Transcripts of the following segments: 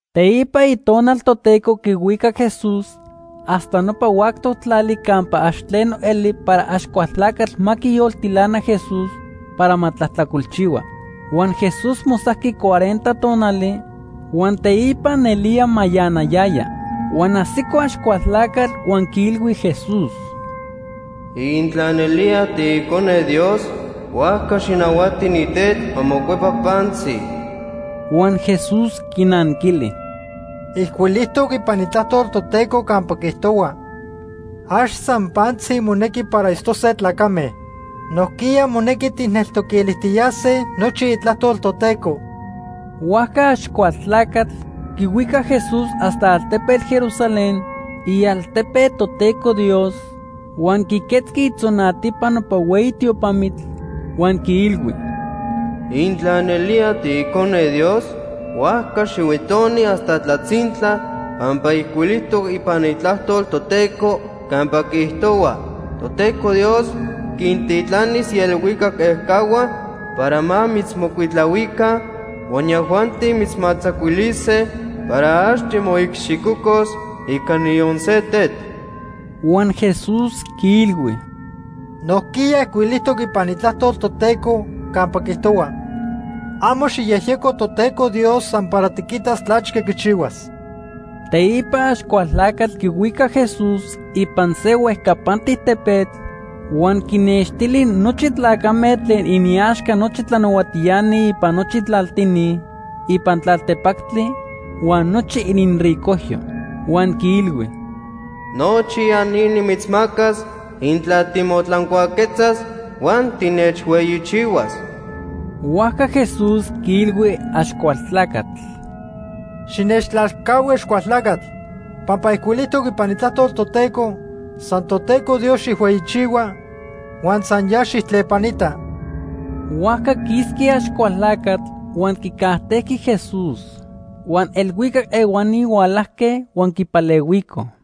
Teipa Itonal Toteco quihuicac Jesús hasta nopa huactoc tlali campa ax tleno eli para Axcualtlacatl ma quiyoltilana Jesús para ma tlajtlacolchihua. Huan Jesús mosajqui cuarenta tonali, huan teipa nelía mayanayaya. Huan ajsico Axcualtlacatl huan quiilhui Jesús: ―Intla nelía tiIcone Dios, huajca xijnahuati ni tetl ma mocuepa pantzi. Huan Jesús quinanquili: ―Ijcuilijtoc ipan Itlajtol Toteco campa quiijtohua: ‘Ax san pantzi monequi para itztose tlacame. Nojquiya monequi tijneltoquilijtiyase nochi Itlajtol Toteco.’ Huajca Axcualtlacatl quihuicac Jesús hasta altepetl Jerusalén, ialtepe Toteco Dios, huan quiquetzqui itzonatipa nopa hueyi tiopamitl, huan quiilhui: ―Intla nelía tiIcone Dios, huajca xihuitoni hasta tlatzintla pampa ijcuilijtoc ipan Itlajtol Toteco campa quiijtohua: ‘Toteco Dios quintitlanis ielhuicac ejcahua para ma mitzmocuitlahuica, huan yajuanti mitzmatzacuilise para ax timoicxicocos ica niyon se tetl.’ Huan Jesús quiilhui: ―Nojquiya ijcuilijtoc ipan Itlajtol Toteco campa quiijtohua: ‘Amo xijyejyeco Toteco Dios san para tiquitas tlachque quichihuas.’ Teipa Axcualtlacatl quihuicac Jesús ipan se huejcapantic tepetl huan quinextili nochi tlacame tlen iniaxca nochi tlanahuatiani ipan nochi tlaltini ipan tlaltepactli huan nochi ininricojyo. Huan quiilhui: ―Nochi ya ni nimitzmacas intla timotlancuaquetzas huan tinechhueyichihuas. Huajca Jesús quiilhui Axcualtlacatl: ―Xinechtlalcahui Axcualtlacatl. Pampa ijcuilijtoc ipan Itlajtol Toteco: ‘San Toteco Dios xijhueyichihua huan san ya xijtlepanita.’ Huajca quisqui Axcualtlacatl huan quicajtejqui Jesús. Huan elhuicac ehuani hualajque huan quipalehuicoj.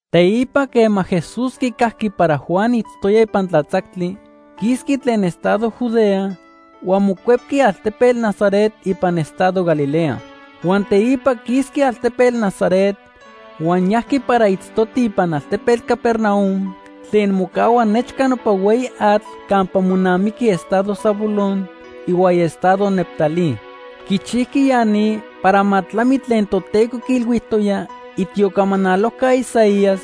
Teipa quema Jesús quicajqui para Juan itztoya ipan tlatzactli, quisqui tlen estado Judea huan mocuepqui altepetl Nazaret ipan estado Galilea. Huan teipa quisqui altepetl Nazaret huan yajqui para itztoti ipan altepetl Capernaum tlen mocahua nechca nopa hueyi atl campa monamiqui estado Zabulón ihuaya estado Neftalí. Quichijqui ya ni para ma tlami tlen Toteco quiilhuijtoya itiocamanalojca Isaías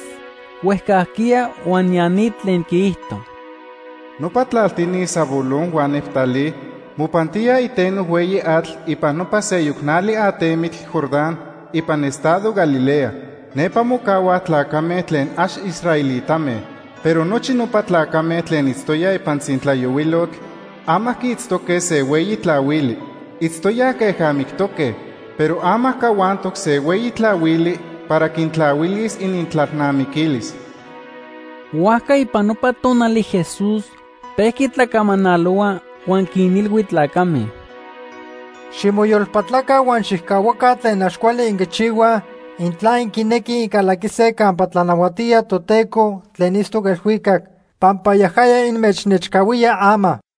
huejcajquiya huan ya ni tlen quiijto: “Nopa tlaltini Zabulón huan Neftalí mopantíaj iteno hueyi atl ipan nopa seyoc nali atemitl Jordán ipan estado Galilea. Nepa mocahuaj tlacame tlen ax israelitame. Pero nochi nopa tlacame tlen itztoyaj ipan tzintlayohuilotl, ama quiitztoque se hueyi tlahuili. Itztoyaj queja mictoque, pero ama cahuantoc se hueyi tlahuili para quintlahuilis inintlalnamiquilis.” Huajca ipan nopa tonali Jesús pejqui tlacamanalohua huan quinilhui tlacame: “Ximoyolpatlaca huan xijcahuaca tlen ax cuali inquichihuaj intla inquinequij incalaquise campa tlanahuatía Toteco tlen itztoc elhuicac, pampa yajaya inmechnechcahuía ama.”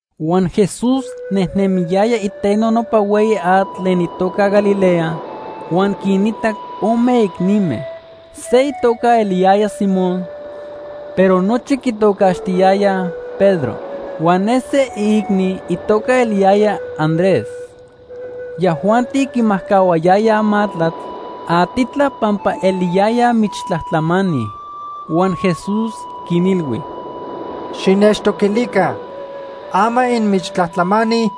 Huan Jesús nejnemiyaya iteno nopa hueyi atl tlen itoca Galilea huan quinitac ome icnime. Se itoca eliyaya Simón, pero nochi quitocaxtiyayaj Pedro. Huan ne se iicni itoca eliyaya Andrés. Yajuanti quimajcahuayayaj matlatl atitla pampa eliyayaj michtlajtlamani. Huan Jesús quinilhui: ―Xinechtoquilica. Ama inmichtlajtlamani,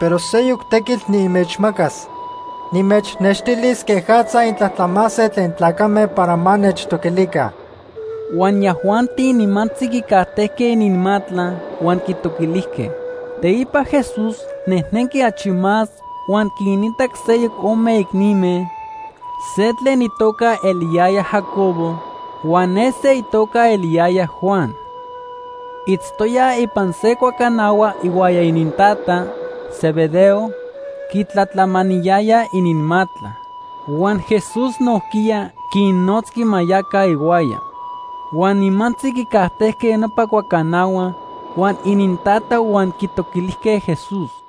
pero seyoc tequitl nimechmacas. Nimechnextilis quejatza intlajtlamase tlen tlacame para ma nechtoquilica. Huan yajuanti nimantzi quicajtejque ininmatla huan quitoquilijque. Teipa Jesús nejnenqui achi más huan quinitac seyoc ome icnime, se tlen itoca eliyaya Jacobo huan ne se itoca eliyaya Juan. Itztoyaj ipan se cuacanahua ihuaya inintata, Zebedeo, quitlatlamaniyayaj ininmatla. Huan Jesús nojquiya quinnotzqui ma yaca ihuaya. Huan nimantzi quicajtejque nopa cuacanahua huan inintata huan quitoquilijque Jesús.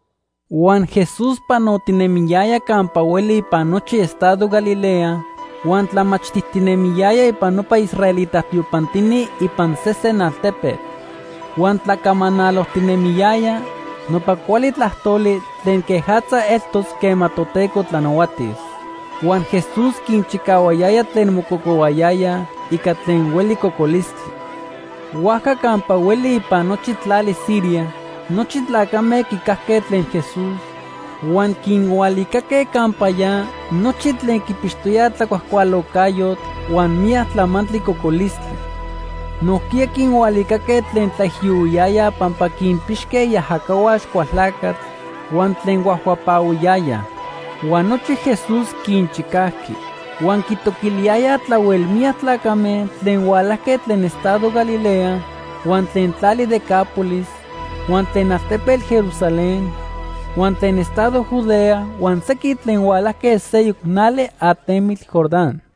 Huan Jesús panotinemiyaya campa hueli ipan nochi estado Galilea huan tlamachtijtinemiyaya ipan nopa israelita tiopantini ipan sesen altepetl. Huan tlacamanalojtinemiyaya nopa cuali tlajtoli tlen quejatza eltos quema Toteco tlanahuatis. Huan Jesús quinchicahuayaya tlen mococohuayayaj ica tlen hueli cocolistli. Huajca campa hueli ipan nochi tlali Siria nochi tlacame quicajque tlen Jesús, huan quinhualicaque campa ya nochi tlen quipixtoyaj tlacuajcualocayotl huan miyac tlamantli cocolistli. Nojquiya quinhualicaque tlen tlaijiyohuiyayaj pampa quinpixque iajacahua Axcualtlacatl, huan tlen huetziyayaj ica ajaca cocolistli huan tlen huajhuapahuiyayaj. Huan nochi Jesús quinchicajqui. Huan quitoquiliyayaj tlahuel miyac tlacame tlen hualajque tlen estado Galilea, huan tlen tlali Decápolis, huan tlen altepetl Jerusalén, huan tlen estado Judea huan sequin tlen hualajque seyoc nali atemitl Jordán.